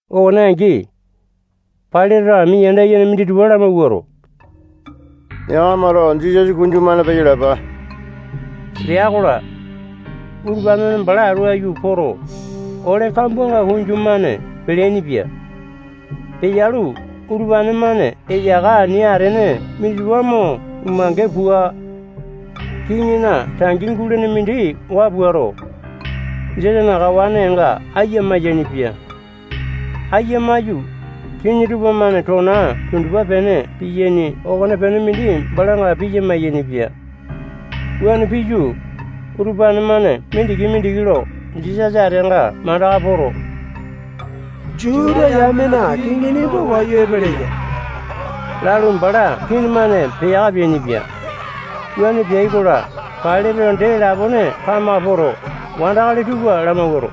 Okone angi, Pailateto ami yanda yene minditupa lamawuato, yakamato Jisasa kunju-mane peyalapa lea-kola, utupane-mane bala atu aiyu poto, ole kambuanga kunju-mane peleaini-pia. Peyalu, utupane-mane eyaka ani atene minditupa mo umange pua, kiŋina tangi gulene mindi waa puato, Jisasana kawanenga aiya maiyaini-pia. Aiya maiyu, kiŋi tupamane tona tundupa-pene piyaini okonepene mindi balanga piya mayainipia. Wuane piyu, utupane-mane mindiki-mindiki lo Jisasa ateanga mandaka poto, Juta yamena kiŋi nimba wayu epeleya lalu, bala kii-mane peyaka peainipia. Wuane peai-kola, Pailateto dee lapone kamaka poto, wandakali tupa lamawuato,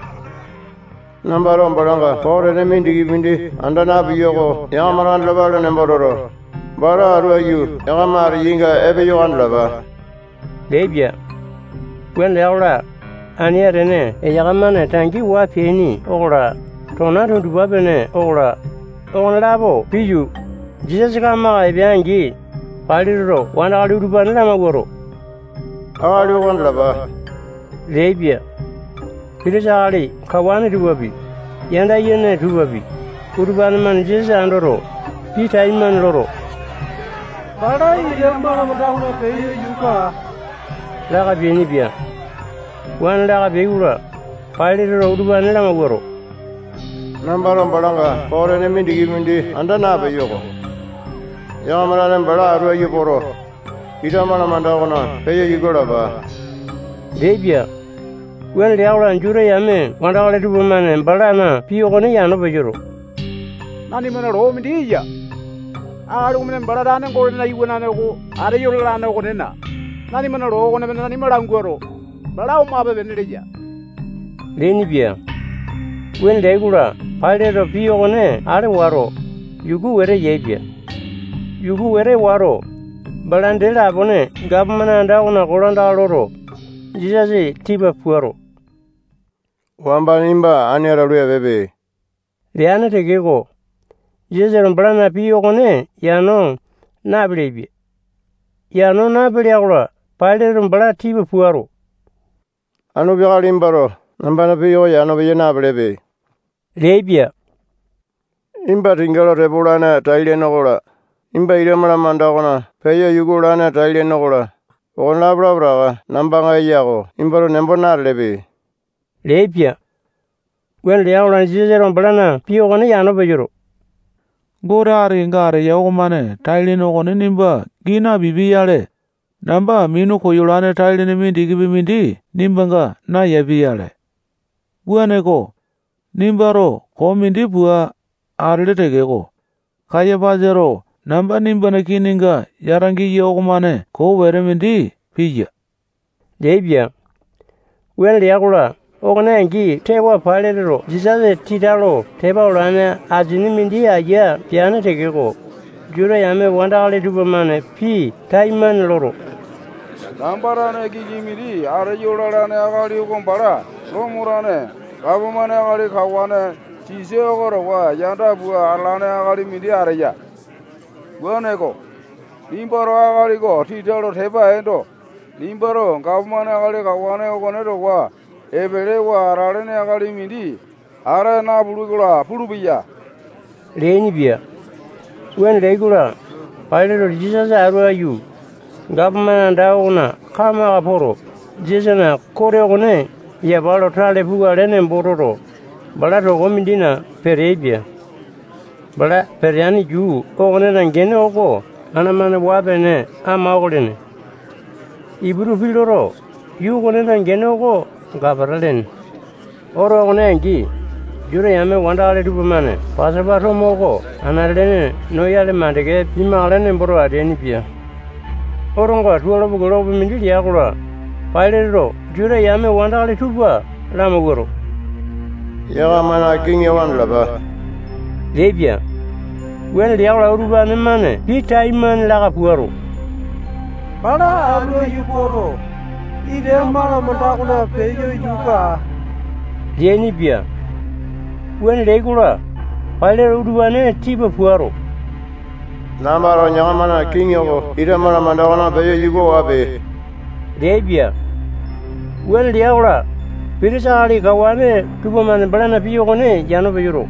nambato balanga koo tene mindikipi mindi anda napeyo oko yakamato andalapale nembo toto, bala atu aiyu yakama ateyainga epeyo oko andalapa leaipia. Wuane lea-kola, ani atene eyaka-mane tangi waa peaini okola, tona tundupa-pene okola, okonelapo piyu, Jisasa kamaka epea-angi, Pailateto wandakali utupane lamawuato, akali oko andalapa leaipia. Pitisa akali kawane tupapi, yanda yene tupapi, utupane-mane Jisasa andoto, pii taimane loto, bala ita malamanda okona peyo yuka aa, laka peainipia. Wuane laka peai-kola, Pailateto utupane lamawuato, nambato balanga koo tene mindikipi mindi anda napeyo-ko. Yakama tane bala atu aiyu poto, ita malamanda okona peyo yuka alapa leaipia. Wuane lea-kola, Juta yame wandakali tupamane balana pii okone yano peyoto, nanimana loo mindi eya. Akali okomane bala tane Gotena Iwanane oko ateyo lalane okonena, nanimana loo okonemane nanima languato, bala omape-pene leya leainipia. Wuane leai-kola, Pailateto pii okone ale wato, yuku wete yaepia. Yuku wete wato, bala dee lapone gapomane anda okona kolandaka loto, Jisasa tipa puato, wamba nimba ani atalu, epeepe leane tekeko, Jisasato balana pii okone yano napeleai-pia. Yano napelea-kola, Pailateto bala tipa puato, anu peakale nimbato nambana pii oko yano peya napelepe leaipia. Nimba tinga lo tepa olane tai-lene okola, nimba ita malamanda okona peyo yuka olane tai-lene okola, okonelapo lapotaka nambanga eya oko nimbato nembo natelepe leaipia. Wuane lea-kola, Jisasato balana pii okone yano peyoto, Gote ati kenga ateya okomane tai-lene okone nimba gii napipia-yale, namba minu koyolane tai-lene mindikipi mindi nimbanga nayapia-yale. Wuaneko, nimbato koo mindi pua atele tekeko, Kayapasato namba nimbana kininga yata giya okomane koo wete mindi piya leaipia. Wuane lea-kola, okone angi tewa, Pailateto Jisasa tita lo tepa olane asini mindi ayia peane tekeko, Juta yame wandakali tupamane pii taimane loto, namba tane kiŋi mindi ateyo lalane akali oko bala Lomo tane gapomane akali kawane Sisa oko towa yanda pua atalane akali mindi ateya. Wuaneko, nimbato akali oko tita lo tepa eendo, nimbato gapomane akali kawane okone towa epelewa atalene akali mindi ata napule-kola pulupeya leainipia. Wuane leai-kola, Pailateto Jisasa atu aiyu, gapomane anda okona kamaka poto, Jisasana kote okone yapa lo tale pukale nembo toto, bala toko mindina peteaipia. Bala peteane yuu okonena gene oko ana-mane waa-pene ama oko lene. Iputu pii loto, yuu okonena gene oko Gapata lene. Oto okone angi, Juta yame wandakali tupamane Pasopa tomo oko anate-lene noyale makande pimakale nemboto ateainipia. Otonga tualo kilokopi mindi lea-kola, Pailateto Juta yame wandakali tupa lamawuato, yakamana kiŋi oko andalapa leaipia. Wuane lea-kola, utupane-mane pii taimane laka puato, bala atu aiyu poto, ita malamanda okona peyo yuka aa leainipia. Wuane leai-kola, Pailateto utupane tipa puato, nambato yakamana kiŋi oko ita malamanda okona peyo yuka wape leaipia. Wuane lea-kola, Pitisa akali kawane tupamane balana pii okone yano peyoto,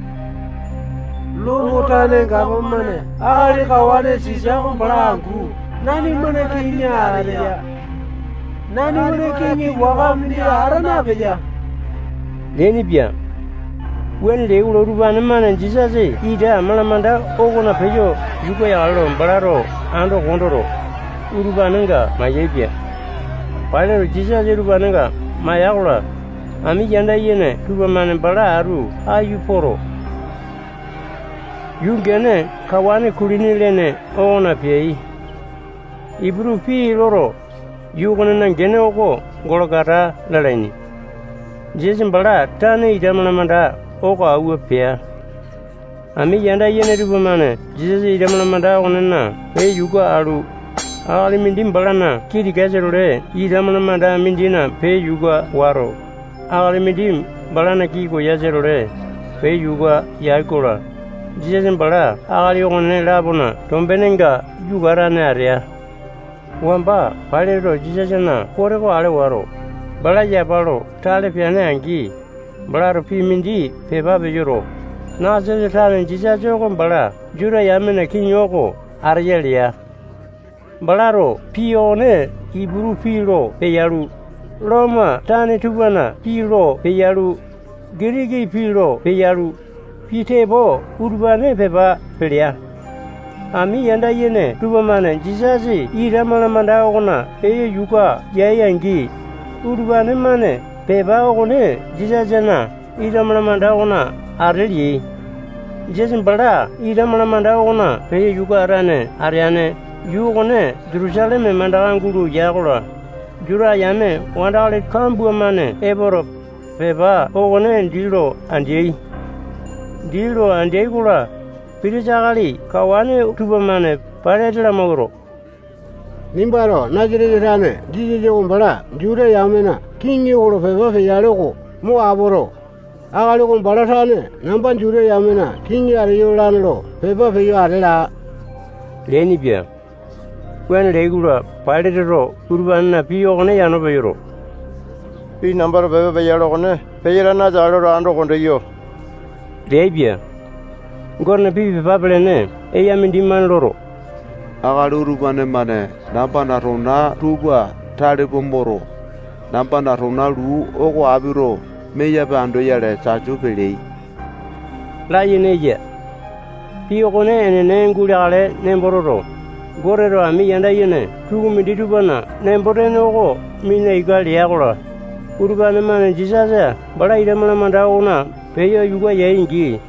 Lomo tane gapomane akali kawane Sisa oko bala angu nanimana kiŋi ateya. Nanimana kiŋi waka mindi ata napeya leainipia. Wuane leai-kola, utupane-mane Jisasa ita malamanda okona peyo yuka yakale lo balato ando kondoto, utupanenga mayaepia. Pailateto Jisasa utupanenga maiya-kola, ami yanda yene tupamane bala atu aiyu poto, yuu gene kawane kulini lene okona peai. Iputu pii loto, yuu okonena gene oko Golokota lalaini. Jisasa bala tane ita malamanda oko awua pea. Ami yanda yene tupamane Jisasa ita malamanda okonena peyo yuka alu, akali mindi balana kii tikasa-tole ita malamanda mindina peyo yuka wato, akali mindi balana kii koyasa-tole peyo yuka yai-kola, Jisasa bala akali okone-lapona tombenenga yuka atane atea. Wamba Pailateto Jisasana kote ale wato, bala yapa lo tale peane-angi, balato pii mindi pepa peyoto, Nasatesa tane Jisasa oko bala Juta yamena kiŋi oko ateya lea. Balato pii okone Iputu pii lo peyalu, Lomo tane tupana pii lo peyalu, Gitiki pii lo peyalu, pii tepo utupane pepa pelea. Ami yanda yene tupamane Jisasa ita malamanda okona peyo yuka yai-angi, utupane-mane pepa okone Jisasana ita malamanda okona ate leai. Jisasa bala ita malamanda okona peyo yuka atane ateane yuu okone Jutusaleme mandaka gulo ya-kola, Juta yame wandakali kambua-mane epoto, pepa okone dii lo andeai. Dii lo andeai-kola, pitisa akali kawane tupamane Pailate lamawuato, nimbato Nasatesa tane Jisasa oko bala Juta yamena kiŋi oko lo pepa peyale oko mo apoto, akali oko bala tane namba Juta yamena kiŋi ateyo lalane lo pepa peyo ate laa leainipia. Wuane leai-kola, Pailateto utupanena pii okone yano peyoto, pii nambato pepa peyalo okone peyatane ateakale lo ando kondeyo leaipia. Gotena pii pepa pelene eya mindimane loto, akali utupane-mane nambana tona tupa tale pua moto, nambana tona luu oko apito meyape andoyale tasu peleai layene eya. Pii okone enene guleakale nembo toto, Goteto ami yanda yene tukumindi tupana nembo-tene oko mina ika lea-kola, utupane-mane Jisasa bala ita malamanda okona peyo yuka yai-angi,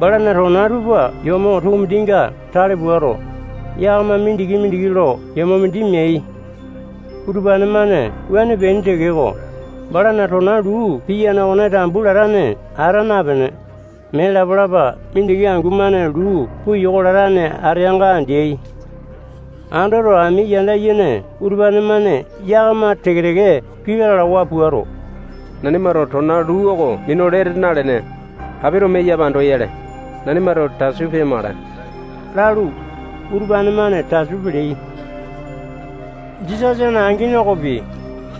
balana tona tupa yomo tukumindinga tale puato, yakama mindiki-mindiki lo yomo mindi meai. Utupane-mane wuane peaini tekeko, balana tona luu piyane okone tambu latane ata napene, mee lapa-lapa mindiki angu-mane luu puyoko latane ateanga andeai. Andoto, ami yanda yene utupane-mane yakama teke-teke pii lalawa puato, nanimato tona luu oko minu lete nalene, apito meyape andoyale, nanimato tasu peyamakale lalu, utupane-mane tasu peleai. Jisasana angini okopi,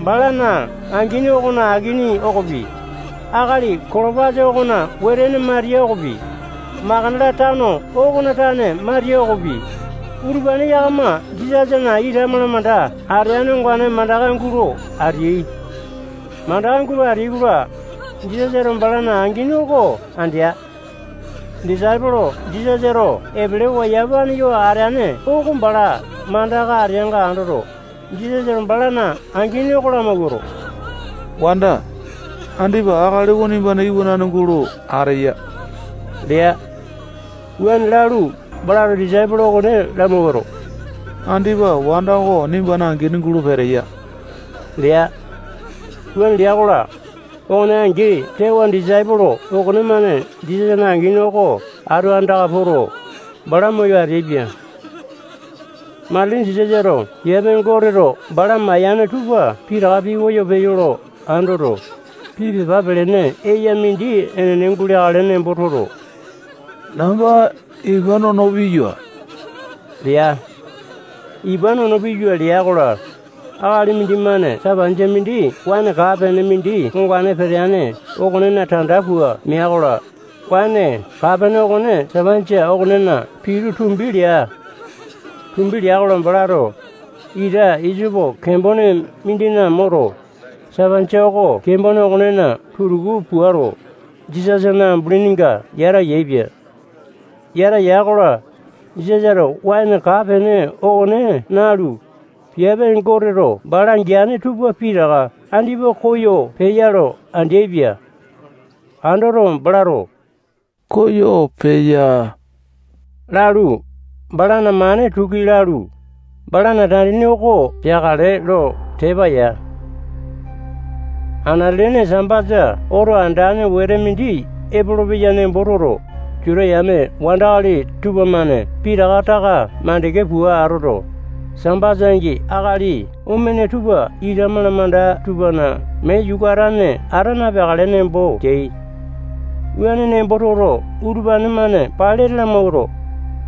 bala angini okona akini okopi, akali Kolopasa okona wetene Matiya okopi, Makatala tano okona tane Matiya okopi, utupane yakama Jisasana ita malamanda ateane ongane mandaka gulo ateai. Mandaka gulo ateai-kola, Jisasato balana angini oko andea. Disaipolo Jisasato epelewa yamapane yo ateane oko bala mandaka ateanga andoto, Jisasato balana angini oko lamawuato, wanda, andipa akali oko nimbana iwanane gulo ateya lea. Wuane lalu, balato disaipolo okone lamawuato, andipa wanda oko nimbana angini gulo peteya lea. Wuane lea-kola, okone angi tewa, disaipolo okonemane Jisasana angini oko atu andaka poto, bala moyo ateaipia. Matili Jisasato piape Goteto bala mayane tupa pitaka pikoyo peyo lo andoto, pii pepa pelene eya mindi enene guleakale nembo toto, namba ipa nono piyua lea. Ipa nono piyua lea-kola, akali mindimane sapanjia mindi waene kaa-pene mindi ongane peteane okonena tanda pua meai-kola, waene kaa-pene okone sapanjia okonena pitu tumbi lea. Tumbi lea-kola, balato ita isopo kembone mindina moto, sapanjia oko kembone okonena tutuku puato, Jisasana ambulinga yata yaepia. Yata ya-kola, Jisasato waene kaa-pene okone nalu, piape Goteto bala geane tupa pitaka andipa koyo peya lo andeaipia. Andoto, balato koyo peya lalu, balana mane tuki lalu, balana tandini oko peakale lo tepa ya. Anate-lene Sambasa oto andane wete mindi epolopeya nembo toto, Juta yame wandakali tupamane pitaka taka makande pua atoto, Sambasa angi akali omene tupa ita malamanda tupana mee yuka atane ata napeakale nembo teai. Wuane nembo toto, utupane-mane Pailate lamawuato,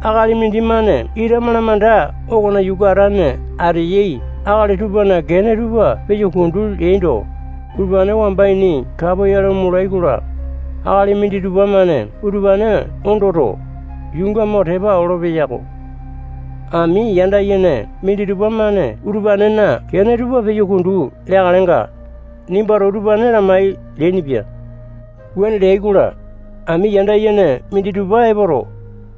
akali mindimane ita malamanda okona yuka atane ateyai akali tupana kene tupa peyo kundu leando, utupane wamba ini kapoyale omolai-kola, akali minditupa-mane utupane ondoto, yuunga mo tepa olopeya-ko. Ami yanda yene minditupa-mane utupanena kene tupa peyo kundu leakalenga, nimbato utupane lamai leainipia. Wuane leai-kola, ami yanda yene minditupa epoto,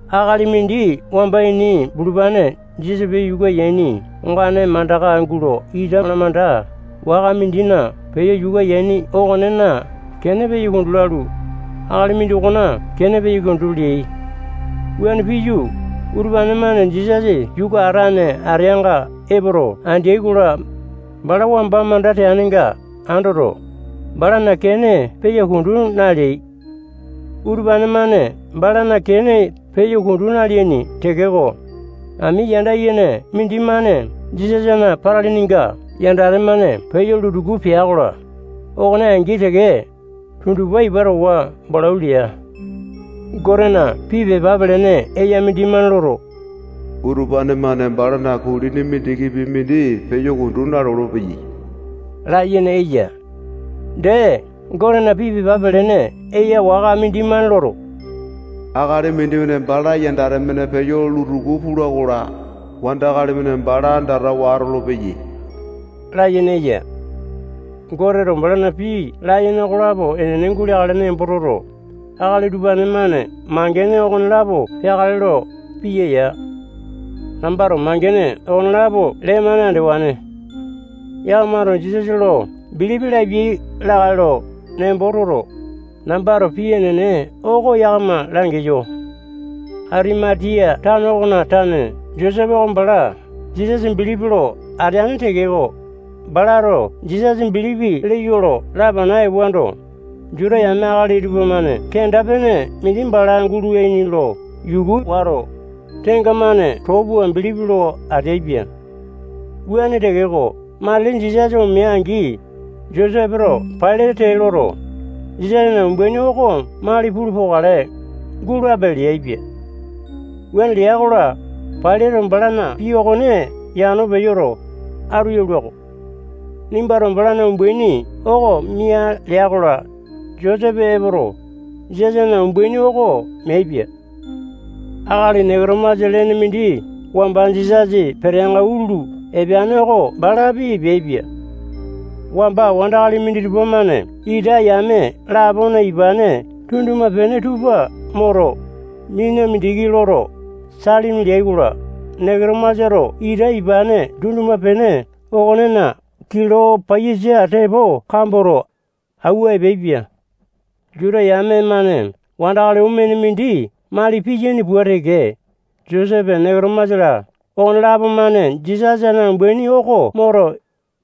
akali mindi wamba ini bulupane Jisasa peyo yuka yaini ongane mandaka gulo ita malamanda waka mindina peyo yuka yaini okonena kene peyo kundu lalu, akali mindokona kene peyo kundu leai. Wuane piyu, utupane-mane Jisasa yuka atane ateanga epoto andeai-kola, bala wamba manda teanenga andoto, balana kene peyo kundu naleai. Utupane-mane balana kene peyo kundu naleaini tekeko, ami yanda yene mindimane Jisasana patilininga yandate-mane peyo lutuku apeya-kola, okone angi teke, tundupa ipa towa balau lea. Gotena pii pepa pelene eya mindimane loto, utupane-mane balana kulini mindikipi mindi peyo kundu nalolo-peyai layene eya. Dee, Gotena pii pepa pelene eya waka mindimane loto, akali mindimane bala yandate-mane peyo lutuku pula-kola, wandakali-mane bala andatawa atolopeyai layene eya. Goteto balana pii layene okonelapo enene guleakale nembo toto, akali utupane-mane mangene okonelapo peakale lo piya ya. Nambato mangene okonelapo lee-mane andewane. Yakamato Jisasa lo bilipi lapiai lakae lo nembo toto, nambato pii enene oko yakama langeyo. Atimatiya tano okona tane Josepe oko bala Jisasa bilipi lo ateane tekeko, balato Jisasa bilipi leyo lo lapana ewando, Juta yame akali tupamane kenda-pene mindi bala gulaini lo yuku wato, tengamane too pua bilipi lo ateaipia. Wuane tekeko, matili Jisasa omea-angi, Josepeto Pailate tee loto, Jisasana umbaini oko mali pulu pokale, gulape leaipia. Wuane lea-kola, Pailateto balana pii okone yano peyoto, atu yalua-ko. Nimbato balana umbaini oko mia lea-kola, Josepe epoto, Jisasana umbaini oko meaipia. Akali Neketomasa lene mindi wamba Jisasa peteanga utulu epeane oko balapi epeaipia. Wamba wandakali minditupa-mane ita yame lapona ipane tunduma-pene tupa moto, mina mindiki loto, salimi leai-kola, Neketomasato ita ipane tunduma-pene okonena kilo paiyasa tepo kamboto, awua epeaipia. Juta yame-mane wandakali omene mindi mali piyaini pua teke, Josepe, Neketomasa-la, okonelapo-mane Jisasana umbaini oko moto,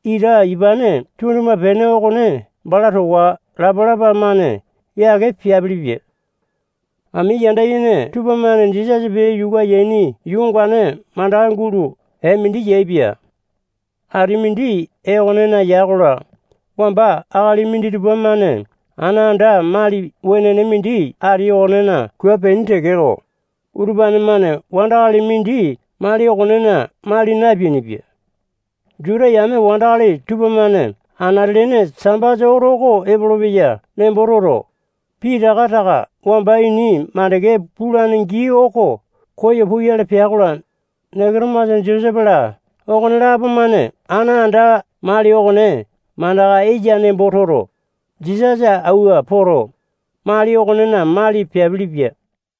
ita ipane tunduma-pene okone bala towa lapalapa-mane yake peapilipia. Ami yanda yene tupamane Jisasa peyo yuku yaini yuu ongane mandaka gulo ee mindi yaepia. Ati mindi ee okonena ya-kola, wamba akali minditupa-mane ana anda mali wenene mindi ati okonena kua peaini tekeko, utupane-mane wandakali mindi mali okonena mali napeainipia. Juta yame wandakali tupamane anate-lene Sambasa oto epolopeya nembo toto, pitaka taka wamba ini makande pulane gii oko koyo puyale pea-kola, Neketomasa, Josepe-la, okonelapo-mane ana anda mali okone mandaka eya nembo toto, Jisasa awua poto, mali okonena mali peapilipia.